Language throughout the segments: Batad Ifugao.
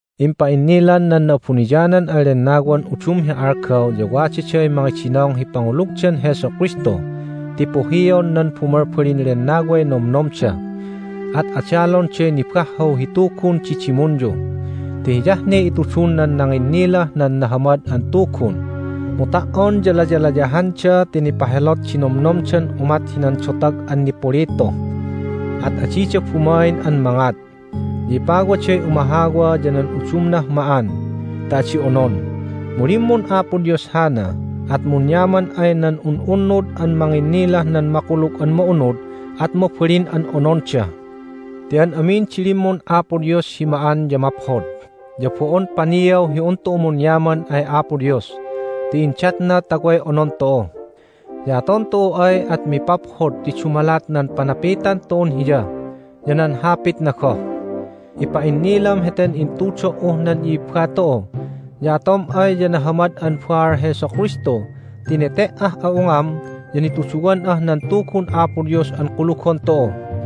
Impa'innilan nan Na'abuniyanan an Lennawan udum hi algaw ya wadaday mangidinong hi pangulugdan Jesu Kristu ti puhion nan bumalbalin lennaway nomnomda, at adalonday nibahhaw hi tugun di dimunyu. Ti hiyah ne itudun nan nanginnilah nan Nahamad an Tugun, mu ta"on ya layalayahanda ti nipahelot di nomnomdan umat hinan dotag an nipulitu, at adida bumain an mangat. Ya ipawaday umahawa ya nan udumnah ma'an ta adi onon, mu limmun Apo Dios hana, at munyaman ay nan un'unnud an manginnilah nan Makulug an Ma'unud at mabalin an ononda. Ti an amin di limmun Apo Dios hi ma'an ya maphod, ya bo'on paniaw hi un tu'u munyaman ay Apo Dios ti indatna ta way onon tu'u. Ya aton tu'u ay at mipaphod ti dumalat nan panapitan tu'un Hiya ya nan Hapitna goh. Ipa'innilam heten intudo"uh nan i'ibba tu'u, ya atom ay ya nahamad'an baal Jesu Kristu ti nete"ah a'ungam ya nituduwan'ah nan Tugun Apo Dios an kulugon tu'u.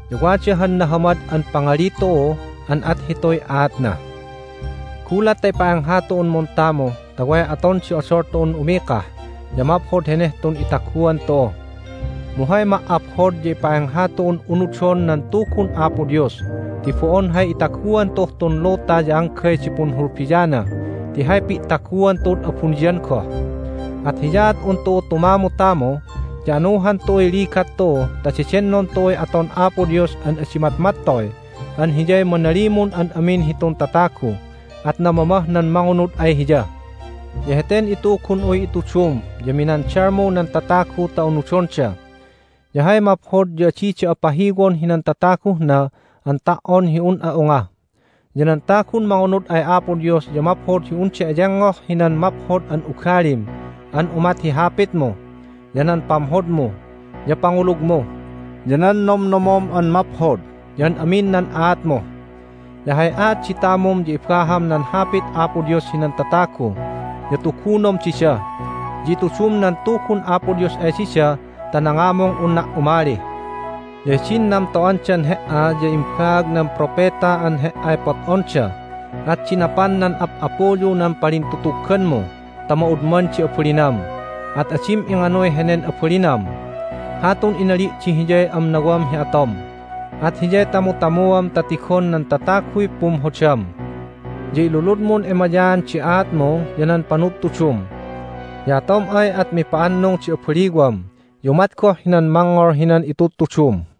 Ya wada han nahamad an pangali tu'u an at hituy aatna: "Gulat ta ipa'engha tu'un muntamu ta way aton di odol tu'un umikah ya maphod heneh tun itaguan tu'u." Mu hay ma"aphod ya ipa'engha tu'un unudon nan Tugun Apo Dios ti bo'on hay itaguan tu'uh tun luta ya anggay di punhulbiana ti hay pi'taguan tu'ud abuniyan goh. At hiyaat un tu'u tumamutamu, ya anuhan tu'uy ligat tu'u ta dedennon tu'uy aton Apo Dios an adi matmattoy an Hiyay manalimun an amin hitun tatagu, at namamah nan mangunud ay Hiya. Ya heten itugun'uy itudum ya minandalmu nan tatagu ta unudonda. Ya hay maphod ya adi da'a pahiwon hinan tataguh na an ta"on hi un'a unga. Ya nan tagun mangunud ay Apo Dios ya maphod hi unda eyengngoh hinan maphod an ugalim an umat hi hapitmu, ya nan pamhodmu, ya pangulugmu, ya nan nomnomom an maphod, ya an amin nan aatmu. Ya hay aat di tamum ya ibaham nan Hapit Apo Dios hinan tatagu, ya tugunom dida, ya itudum nan Tugun Apo Dios ay dida ta nangamung unna' umali. Ya hidin namto'andan he"a ya imbaag nan propeta an he"ay pot'onda, at dinapan nan ap'apuyu nan palintutugganmu ta ma'udman di abalinam, at adim inganuy henen abalinam. Hatun inali' di hiyay amnawam hi atom, at hiyay tamutamuam ta tigon nan tataguy pumhodam. Ya iluludmun emayaan di aatmu ya nan panudtudum. Ya atom ay at mipa'annung di abaliwam, ya umat goh hinan mangngol hinan itudtudum.